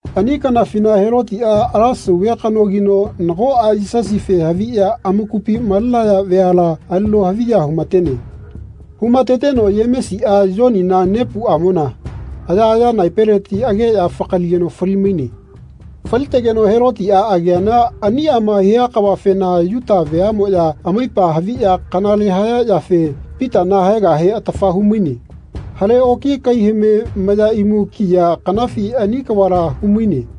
Ani kanafina Helotiꞌa ala sauve kanogino nagoꞌa Yisasife haviꞌya amakupi malenaya veala alino haviya humatene. Humateteno Yemesiꞌa Yonina nepuꞌamona ayaꞌaya naepeleti ageꞌya fakaligeno fali-maine. Falitegeno Helotiꞌa ageana aniꞌama hia kavafena Yuta veaꞌmoꞌya amaipa haviꞌya kanale haya yafe Pitana haegahe atafa humaine. Hale oki kaihame maya imu kiya kanafi ani kavala humaine.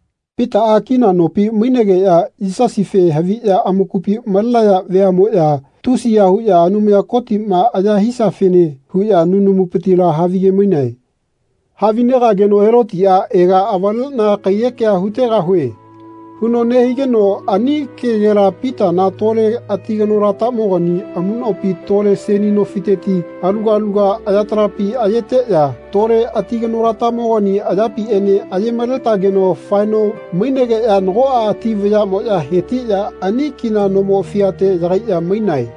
Pitaꞌa kina nopi mainegeꞌya Yisasife haviꞌya amakupi malenaya veaꞌmoꞌya tusiya huꞌya Anumaya Kotiꞌma aya hisiafene huꞌya nunamupitila havigemainae. Havinegageno Helotiꞌa “Ega avaleꞌna kaiyekea hutegahue.” huno nehigeno ani kegela Pitana tole ati kanolatamogani amuꞌnopi tole seni nofiteti aluga aluga ayatalapi ayeteꞌya tole ati kanolatamogani anayapiꞌene aye-maletageno faeno mainegeꞌya nagoꞌa ati vayaꞌmoꞌya hetiꞌya ani kina nomo fiate yagaiꞌya mainae.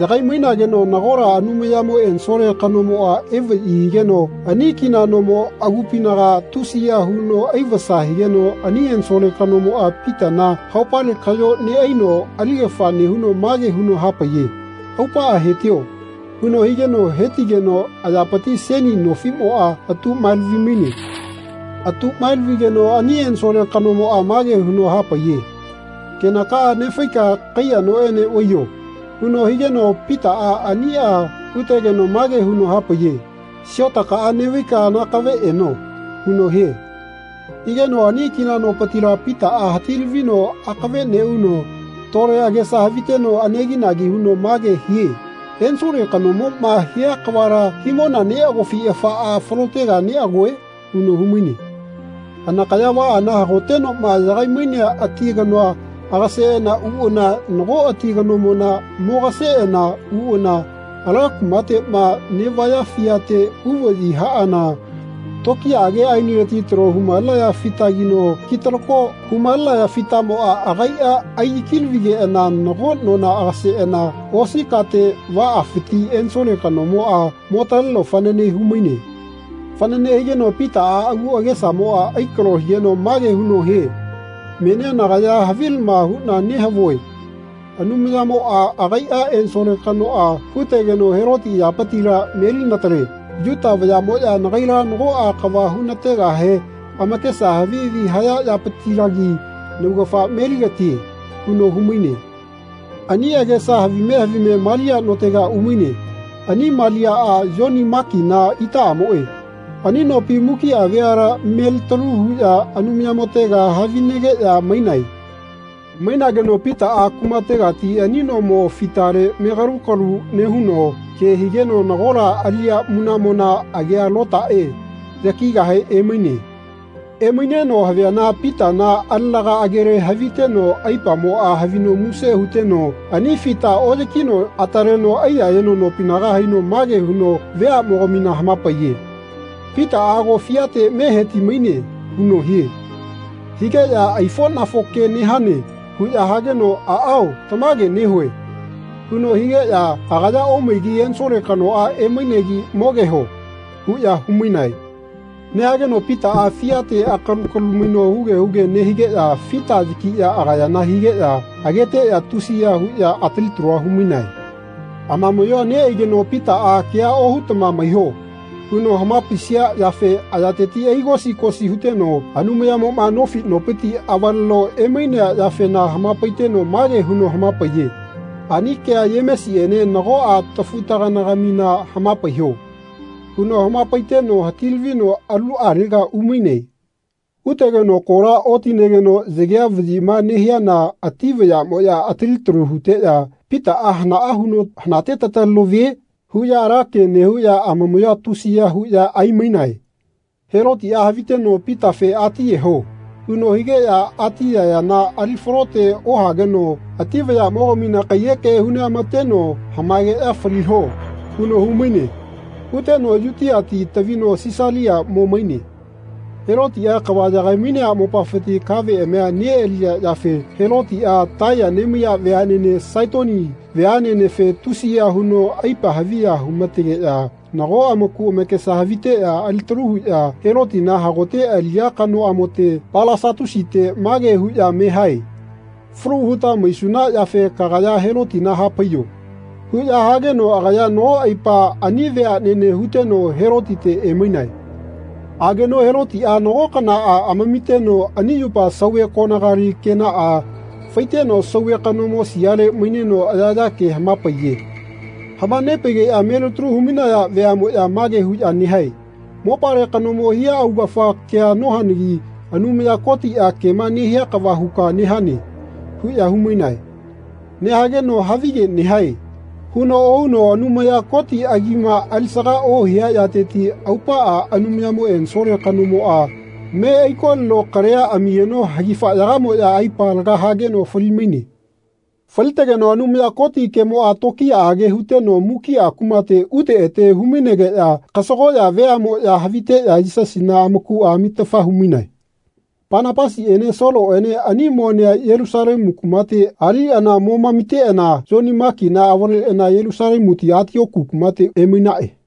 Yagai-mainageno nagola Anumayamo ensole kanomoꞌa evaꞌyi higeno ani kina nomo agupinaga tusiya huno aivasa higeno ani ensole kanomoꞌa Pitana haopale kaꞌyo neꞌaino aligafa nehuno mage huno hapaiye “Aupaꞌa hetio.” huno higeno hetigeno ayapiti seni nofiꞌmoꞌa atuꞌmaelavi-maine. Atuꞌmae-lavigeno ani ensole kanomoꞌa mage huno hapaiye “Kenakaꞌa nefaika kaiya noꞌene vaiyo.” huno higeno Pitaꞌa aniꞌa hutegeno mage huno hapaiye “Siotaka neꞌvaika nakave eno.” huno hie. Higeno ani kina nopitila Pitaꞌa hati-lavino akave neꞌuno tole agesa haviteno aneginagi huno mage hie “Ensole kanomoꞌma hia kavala himona neꞌagofi afaꞌa falotega neꞌagoe?” huno humaine. Anakaya vaꞌana hagotenoꞌma yagai-mainea ati kanoa agaseꞌana uꞌana nago ati kanomona mogaseꞌana uꞌana ala kumateꞌma neꞌvaya fiate uvaꞌyi haꞌana tokiyaꞌage aenileti talo humalenaya fitagino kitalako humalenaya fitamoꞌa agaiꞌa aiyaki-lavigeꞌana nago nona agaseꞌana osi kate vaꞌafiti ensole kanomoꞌa motaleno fanane humaine. Fanane higeno Pitana agu agesamoꞌa aikalo higeno mage huno hie “Menia nagaya havilama huꞌna nehavue Anumayamoꞌa agaiꞌa ensole kanoꞌa hutegeno Heloti ayapitila melinatale. Yuta vayaꞌmoꞌya nagaila nagoꞌa kava hunategahe amakesa havi havi haya yapitilagi naugafa meligatie.” huno humaine. Ani agesa havime havime Malia notega umaine. Ani Maliaꞌa Yoni Makina itaꞌamoꞌe. Ani nopi mukiꞌa veala melitalu huꞌya Anumayamotega havinegeꞌya mainae. Mainageno Pitaꞌa kumategati ani nomo fitale mekalu kalu nehuno ke higeno nagola aliꞌya munaꞌmona agia Lotaꞌe yakigahe emaine. Emaineno haviana Pitana alenaga agele haviteno aipamoꞌa havino muse huteno ani fita oꞌyakino ataleno aiyayeno nopinaga haino mage huno veaꞌmogamina hamapaiye “Pitaꞌa ago fiate me heti-maine.” huno hie. Higeꞌya “Aifoꞌnafo ke nehane.” huꞌya hageno “Aꞌao, tamage nehue.” huno higeꞌya “Agaya omaigi ensole kanoꞌa emainegi mogeho.” huꞌya humainae. Nehageno Pitaꞌa fitale akalu kalu maino huge huge nehigeꞌya fita yakiꞌya agayana higeꞌya ageteꞌya tusiya huꞌya atali talua humainae. Amamaꞌyoa neꞌaigeno Pitaꞌa “Kea ohutama maiho.” huno hamapaisia yafe ayateti aigo-sigosi huteno Anumayamoꞌma nofi nopiti avaleno emainea yafena hamapaiteno mage huno hamapaiye “Ani kea Yemesiꞌene nagoꞌa tafu-taganagamina hamapaiho.” huno hamapaiteno hati-lavino aluꞌalega umaine. Utegeno kola otinegeno yagea vaꞌyima nehiana ati vayaꞌmoꞌya atali talu huteꞌya “Pitaꞌa hanaꞌa huno hanate tataleno vie?” huꞌya ala ke nehuꞌya amamaꞌyoa tusiya huno aimaine. Helotiꞌa haviteno “Pitafe atiyeho.” huno higeꞌya ati ayayana ali falote ohageno ati vayaꞌmogamina kaiyeke huneꞌamateno “Hamaegeꞌya faliho.” huno humaine. Huteno Yutiati tavino Sisalia mo maine. Helotiꞌa kava yagai-mainea mopafiti kaveꞌamia neꞌaliya yafe Helotiꞌa Taiya nemaiya veaꞌnene Saitoni veaꞌnenefe tusiya huno aipa haviya humategeꞌya nago amaku amakesa haviteꞌya alitalu huꞌya Helotina hagote aliꞌya kanoꞌamote Palasatusite mage huꞌya me hae “Falu huta maisuna yafe kagaya Helotina hapaiyo.” huꞌya hageno agaya nago aipa ani veaꞌnene huteno Helotite emainae. Ageno Helotiꞌa nago kanaꞌa amamiteno ani yupa sauve konagali kenaꞌa faiteno sauve kanomo siale maineno ayaꞌaya ke hamapaiye. Hamanepaigeꞌya melitalu humainaya veaꞌmoꞌya mage huꞌya nehae “Mopale kanomo hia augafa kea nohanagi Anumaya Kotiꞌa kema nehia kava huka nehane.” huꞌya humainae. Nehageno “Havige nehae.” huno ohuno Anumaya Koti agima alisaga ohia yateti aupaꞌa Anumayamo ensole kanomoꞌa me aikolino kalia amigeno hagifaꞌyagamoꞌya aipa laga hageno fali-maine. Falitegeno Anumaya Koti kemoꞌa tokiyaꞌage huteno mukiꞌa kumate ute ete humainegeꞌya kasagoꞌya veaꞌmoꞌya haviteꞌya Yisasina amakuꞌa amitafa humainae. Panapasiꞌene Soloꞌene ani monea Yelusalemu kumate aliꞌana momamiteꞌana Yoni Makina avaleꞌana Yelusalemuti Atioku kumate emainaꞌe.